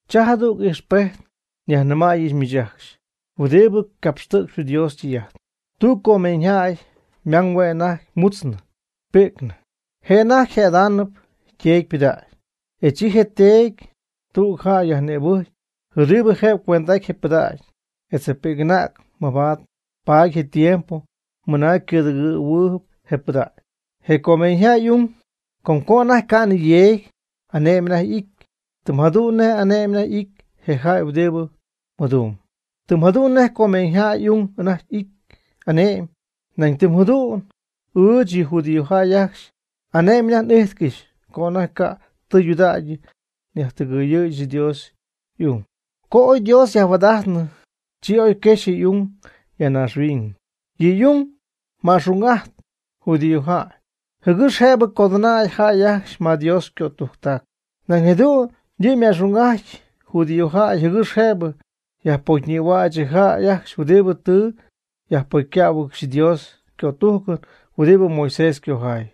Cha jadüg ijxpejt nyajnɨmäyɨch miich ajcxy huɨdibɨ capxtɨ̈cxp Dios ytɨy'ajt. Tüg comeeñyjäy ymang hue' anajty mutznɨ pi'cnɨ je' anajty jëdaanɨp yteedy ypɨdägy. E chi yteedy tüg jäy yajnïbɨcy huɨdibɨ jëbɨ cuend'aty je pɨdägy etz je pi'c'anäg mabaad paady je tiempo mɨna ycɨ̈dɨgɨ̈huɨɨgy je pɨdägy. Je comeeñyjäy y'ung com co anajty ca'nɨ yeegy, ane'my anajty y'ity, tɨm jadu'n nej ane'my y'ity je jäy huɨdibɨ mɨdumb. Tɨm jadu'n nej je comeeñyjäy y'ung anajty y'ity ane'my, nañ tɨm jadu'n ɨɨch yɨ judíojäy ajcxy ane'my anajty n'íjtcɨxyɨch co anajty ca' tɨydudägy naydijɨ́ɨygɨxyɨch Dios y'ung. Co oy Dios yajhuaad'ajtnɨ, chi oy quejxnɨ y'ung ya naaxhuiñ. Yɨ' y'ung ma'xung'ajt judíojäy, jɨgɨx jëbɨ codɨnäy jäy ajcxy ma Dios ycötujctac. Nañ jadu'n yɨ' ma'xung'ajt judíojäy jɨgɨx jëbɨ yajpocyñïhuäch yɨ jäy ajcxy huɨdibɨ tɨ yajpocycähuɨgɨxy Dios ycötujcɨn huɨdibɨ Moisés ycojay.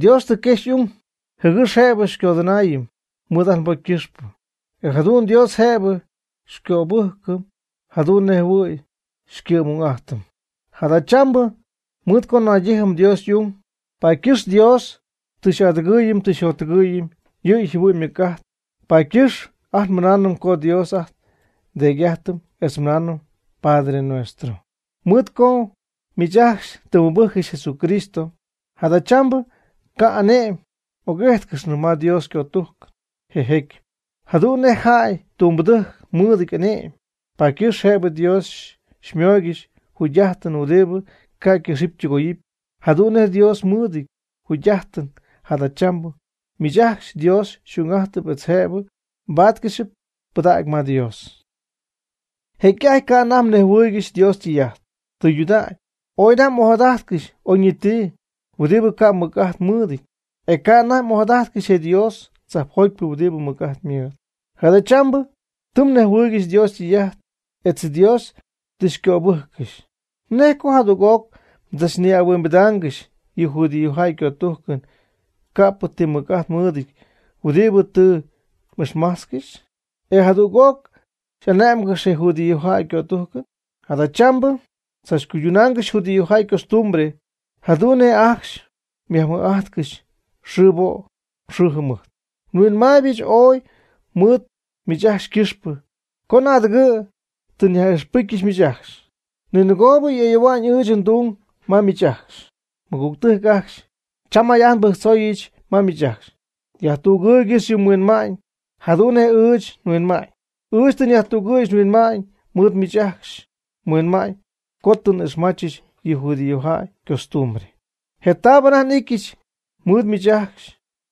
Dios tɨ quexy y'ung jɨgɨx jëbɨ xycodɨnaayɨm mɨɨd ajt nbocy ycɨxpɨ, e jadu'n Dios jëbɨ xycöbɨjcɨ jadu'n nej jɨhuɨ̈y xycɨ'm'ung'ajtɨm. Jadachambɨ mɨɨd co naydijɨm Dios y'ung, paady ycɨxp Dios tɨ xy'adɨgɨɨyɨm tɨ xyjottɨgɨɨyɨm yɨ' yjɨhuɨ'ñ ymɨc'ajt, paady ycɨxp ajt mɨnaanɨm co Dios ajt nDeedy'ajtɨm etz nmɨnaanɨm: “¡Padre Nuestro!” Mɨɨd co miich ajcxy tɨ mmɨbɨjccɨxy Jesucristo, jadachambɨ ca' ane'my m'oc'íjtcɨxyñɨ ma Dios ycötujcɨn je jecyɨp, jadu'n nej je jäy ytumbɨdɨjc mɨɨdɨty ane'my. Paady ycɨxp jëbɨ Dios xymóoygɨxɨpy jugy'ajtɨn huɨdibɨ ca' ycɨxɨpy ytɨgoyɨpy, jadu'n nej Dios mɨɨdɨty jugy'ajtɨn. Jadachambɨ miich ajcxy Dios xy'ung'ajt, etz jëbɨ mbáatcɨxɨpy pɨdägy ma Dios. Jecy'ajty ca' anajty mnejhuɨɨygɨxy Dios ytɨy'ajt tɨydudägy, ooy anajty m'ojadajtcɨxy oyñiti huɨdibɨ ca' ymɨc'ajt mɨɨdɨty. E ca' anajty m'ojadajtcɨxy je Dios tzajpjotyp huɨdibɨ mɨc'ajt mɨɨdɨty. Jadachambɨ tɨ mnejhuɨɨygɨxy Dios ytɨy'ajt etz Dios tɨ xycöbɨjccɨxy. ¿Nej co jadüg'oc mdzachnihuimbidaangɨxy yɨ judíojäy ycötujcɨn, ca'p ti mɨc'ajt mɨɨdɨty, huɨdibɨ tɨ m'ijxmajtzcɨxy? E jadüg'oc xy'ane'mygɨxy je judíojäy ycötujcɨn. Jadachambɨ mdzachcuydunaangɨxy judíojäy ycostumbre, jadu'n nej ajcxy myajmɨj'ajtcɨxy xɨɨbo' xɨɨjɨmɨjt. Huinmaaybɨch ooy mɨɨd miich ajcxy ycɨxpɨ co naadɨgɨ̈ tɨ nyaj'ixpɨcyɨch miich ajcxy. Ninɨgoob ayoohua'ñ ɨɨch ndung ma miich ajcxy. Mɨgügtɨjc ajcxy, cham may'ajt nbɨjctzooyɨch ma miich ajcxy. Yajtügɨɨygɨx yɨ mhuinma'ñ jadu'n nej ɨɨch nhuinma'ñ. Ɨɨch tɨ nyajtügɨ̈yɨch nhuinma'ñ mɨɨd miich ajcxy mhuinma'ñ co tɨ n'ixmachɨch yɨ judíojäy ycostumbre. Je taab anajty n'ityɨch mɨɨd miich ajcxy,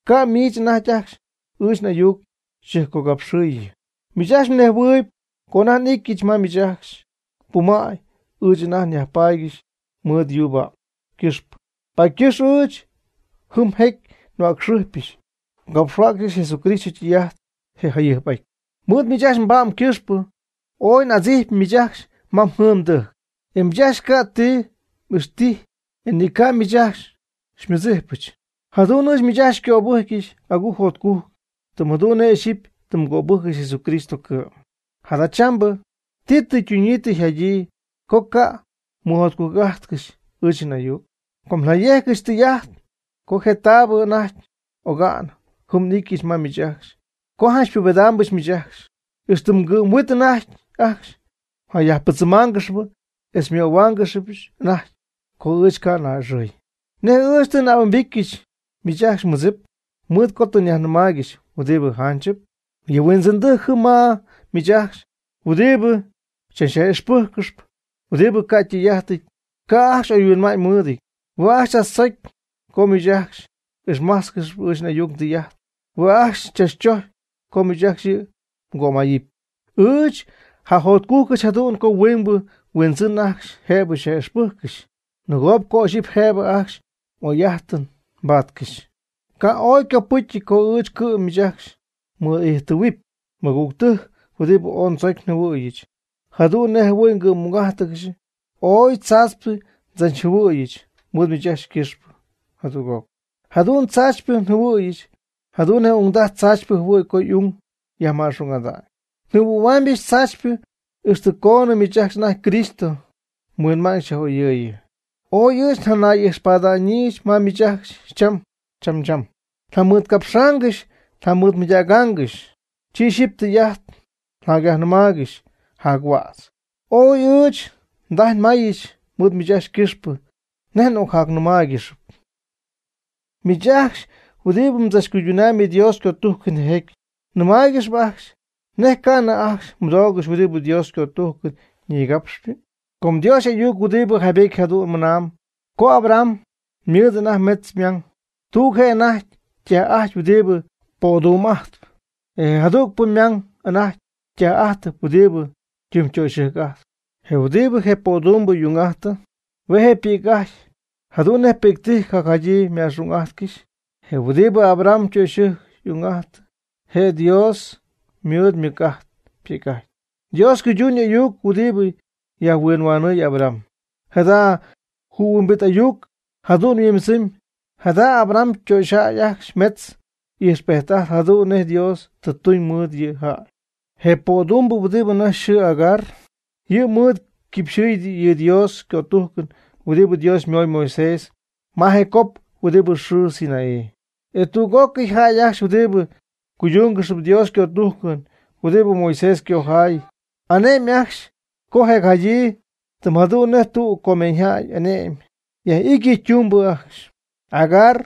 ca' miich anajty ajcxy ɨɨch n'ayuc xyjɨjpcogapxɨɨyɨ. Miich ajcxy mnejhuɨɨyb co anajty n'ityɨch ma miich ajcxy, pumäy ɨɨch anajty nyajpaady mɨɨd yuu pa'm ycɨxpɨ, paady ycɨxp ɨɨch jɨm jecy nhuäcxɨjpyɨch, ngapxhuäcxyɨch Jesucristo ytɨy'ajt je jayɨjp'aty. Mɨɨd ɨɨch nba'm ycɨxpɨ ooy n'adzijpy miich ajcxy ma mjɨɨn mdɨjc, e miich ajcxy ca' tɨ xy'ixtijy e ni ca' miich ajcxy xymɨdzijpɨch. Jadu'n ɨɨch miich ajcxy xycöbɨjcy agujc jotcujc, tɨm jadu'n nej ixyipy tɨ mgöbɨjccɨxy Jesucristo cɨ'm. Jadachambɨ ¿ti tɨ ytunyii tɨ yjadyii co ca' mmɨjotcujc'ajtcɨxy ɨɨch n'ayuc? Com nyejcɨch tɨy'ajt co je taabɨ anajty oga'n jɨm n'ityɨch ma miich ajcxy co janch xypubedaambɨch miich ajcxy. Ixtɨ mgɨ'm huiin anajty ajcxy mjayajpɨdzɨmaangɨxyp etz xymöhuaangɨxyɨch anajty co ɨɨch ngaa'a'ɨxɨy. ¿Nej ɨɨch tɨ n'ahuimbityɨch miich ajcxy mmɨdzɨp mɨɨd co tɨ nyajnɨmaaygɨxy huɨdibɨ janchɨp? Yɨ huindzɨndɨjc jɨm ma miich ajcxy huɨdibɨ xychachyaj'ixpɨjccɨxp huɨdibɨ ca' ytɨy'ajtɨty, ca' ajcxy oyhuinma'ñ mɨɨdɨty. Hue' ajcxy tzachtzocy co miich ajcxy m'ixmájtzcɨxɨp ɨɨch n'ayuc ndɨy'ajt. Hue' ajcxy tzachtzocy co miich ajcxy yɨ' mgömayɨpy. Ɨɨch njajotcujcɨch jadu'n co huingbɨ huindzɨn ajcxy jëbɨ xyaj'ixpɨjccɨxy. Nɨgoobɨ co ixyipy jëbɨ ajcxy m'oy'ajtɨn mbaatcɨxy. Ca' oy copɨcyɨty co ɨɨch cɨ'm miich ajcxy nmɨɨd'ijttɨɨhuɨpy. Mɨgügtɨjc huɨdibɨ ooy ndzocy njɨhuɨ̈yɨch jadu'n nej jɨhuɨ̈y ngɨ'm'ung'ájtɨgɨxy, ooy tzaachypɨ ndzachjɨhuɨ̈yɨch mɨɨd miich ajcxy ycɨxpɨ jadüg'oc. Jadu'n tzaachypɨ njɨhuɨ̈yɨch jadu'n nej ungdaj tzaachypɨ jɨhuɨ̈y co y'ung yajma'xung'ada'ñ. Njɨhuɨ̈huaamybɨch tzaachypɨ ixtɨ coonɨ miich ajcxy anajty Cristo mhuinma'ñ xyaj'oyɨɨyɨ. Ooy ɨɨch njanay'ijxpada'ñyii ma miich ajcxy cham cham. Njamɨɨdcapxaangɨxy njamɨɨdmɨydägaangɨxy, chi ixyipy tɨy'ajt njacyajnɨmaaygɨxy jac huädz. Ooy ɨɨch ndajy nmayɨch mɨɨd miich ajcxy ycɨxpɨ, nej n'ocjacnɨmaaygɨxyɨpy. Miich ajcxy huɨdibɨ mdzachcuydunamyb Dios ycötujcɨn je jecyɨp. Nmɨmaaygɨxy ajcxy, ¿nej ca'nɨ ajcxy mɨdoogɨxy huɨdibɨ Dios ycötujcɨn nigapxypɨ? Com Dios y'ayuc huɨdibɨ jaybetyɨp jadu'n ymɨna'ñ co Abraham ymɨɨd anajty metz ymang. Tüg je'anajty ytaj'ajtɨp huɨdibɨ ypödumb'ajtpy. Je jadügpɨ ymang anajty ytaj'ajtɨp huɨdibɨ ytimytöxɨjc'ajtpy. Je huɨdibɨ je pödumbɨ y'ung'ajtɨ, hue' je' ypi'c'ajty jadu'n nej pi'ctɨjc jadyii yma'xung'ajtcɨxy. Je huɨdibɨ Abraham ytöxyɨjc y'ung'ajtɨ Dios je' mɨɨd ymɨc'ajt ypi'c'ajty, Dios ycuyduun y'ayuc huɨdibɨ yajhuinhuanɨɨy Abraham. Jada jɨhuimbit ayuc jadu'n yhuimbidzɨmyb: jada Abraham ytöxyjäy ajcxy metz ijxpejt'ajtp jadu'n nej Dios tɨ ytuñ mɨɨd yɨ' yjäy. Je ypödumbɨ huɨdi anajty yxɨɨ Agar, yɨ' mɨɨd yquipxɨ̈y yɨ Dios ycötujcɨn huɨdibɨ Dios ymoy Moisés ma je cop huɨdi yxɨɨ Sinaí. E tüg'ócɨy jäy ajcxy huɨdibɨ cuyduungɨxp Dios ycötujcɨn huɨdibɨ Moisés ycojay, ane'my ajcxy je' yaj'idyii, tɨm jadu'n nej tüg comeeñyjäy ane'my yaj'ity yɨ' ytumbɨ ajcxy. Agar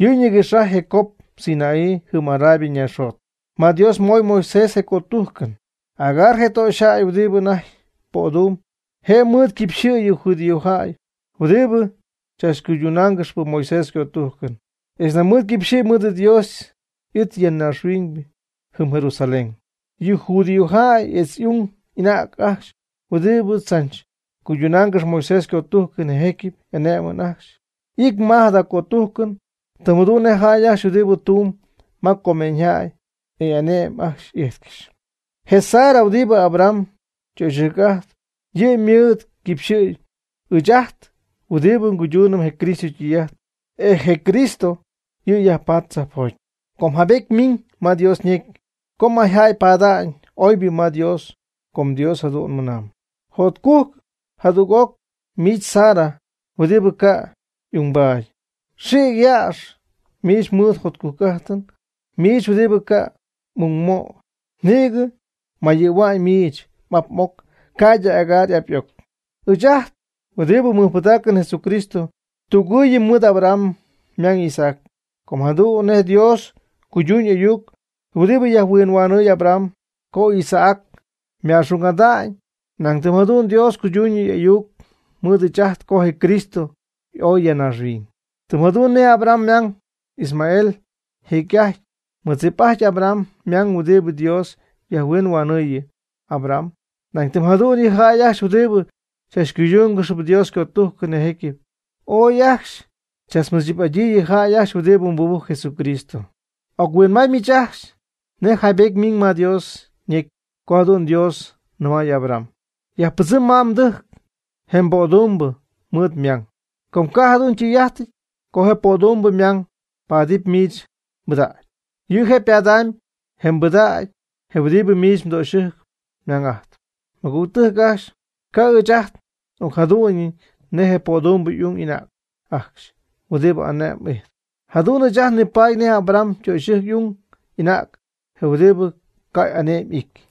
yɨ' nïgɨx'ajtp je cop Sinaí jɨm Arabia ñaaxjot ma Dios moy Moisés je cötujcɨn. Agar je töxyjäy huɨdibɨ anajty pödumb, je' mɨɨd yquipxɨ̈y yɨ judíojäy huɨdibɨ tzachcuyduungɨxp Moisés ycötujcɨn, etz nañ yquipxɨ̈y mɨɨd Dios y'it ya naaxhuiñ jɨm Jerusalén. Yɨ judíojäy etz y'ung y'anäg ajcxy huɨdibɨ tzach cuyduungɨxy Moisés ycötujcɨn je jecyɨp, ane'my ajcxy y'ity ma jada cötujcɨn, tɨm jadu'n nej jäy ajcxy huɨdibɨ tumb ma comeeñyjäy, e y'ane'my ajcxy y'ijtcɨxy. Je Sara huɨdibɨ Abraham ytöxyɨjc'ajtpy, yɨ' mɨɨd yquipxɨ̈y ɨɨch ajt huɨdibɨ cuydumb je Cristo ytɨy'ajt, e je Cristo yɨ' yajpatp tzajpjoty. Com jaybetyɨty ymiñ ma Dios ñecy co mayjäy paada'ñ oybɨ ma Dios, com Dios jadu'n ymɨna'ñ: Jotcugɨ' jadüg'oc miich Sara huɨdibɨ ca' y'ungbaady. Xïc yäx miich mɨɨd jotcujc'ajtɨn, miich huɨdibɨ ca' ungmoy. Nïgɨ ymayɨ̈hua'ñ miich m'ap m'oc ca'ydɨ Hagar y'ap y'oc. Ɨɨch ajt huɨdibɨ nmɨjpɨdaacɨm Jesucristo tügɨɨyɨm mɨɨd Abraham ymang Isaac. Com jadu'n nej Dios cuyduuñ y'ayuc huɨdibɨ yajhuinhuanɨɨy Abraham co Isaac yma'xung'ajty, nañ tɨm jadu'n Dios cuyduuñ yɨ' y'ayuc mɨɨd ɨɨch ajt co je Cristo y'oy ya naaxhuiñ. Tɨm jadu'n nej Abraham ymang Ismael jecy'ajty mɨdzip'ajty Abraham ymang huɨdibɨ Dios yajhuinhuanɨɨyɨ Abraham; nañ tɨm jadu'n yɨ jäy ajcxy huɨdibɨ tzachcuydungɨxp Dios ycötujcɨn je jecyɨp, ooy ajcxy tzach mɨdzip'adyii yɨ jäy ajcxy huɨdibɨ mɨbɨjcp Jesucristo. Oc-huinmay miich ajcxy nej jaybetyɨty ymiñ ma Dios ñecy co jadu'n Dios nɨmay Abraham: Yajpɨdzɨm ma mdɨjc je mbödumbɨ mɨɨd ymang. Com ca' jadu'n ytɨy'ajtɨty co je pödumbɨ ymang paadɨpy miich mbɨdägy. Yɨ' je' padamb je mbɨdägy huɨdibɨ miich mdöxyɨjc ymang'ajtpy. Mɨgügtɨjc ajcxy, ca' ɨɨch ajt n'ocjadu'nɨñ nej je pödumbɨ y'ung y'anäg ajcxy huɨdi ane'my ijtp. Jadu'n ɨɨch ajt nipaady nej Abraham ytöxyɨjc y'ung y'anäg huɨdibɨ ca' y'ane'my y'ity.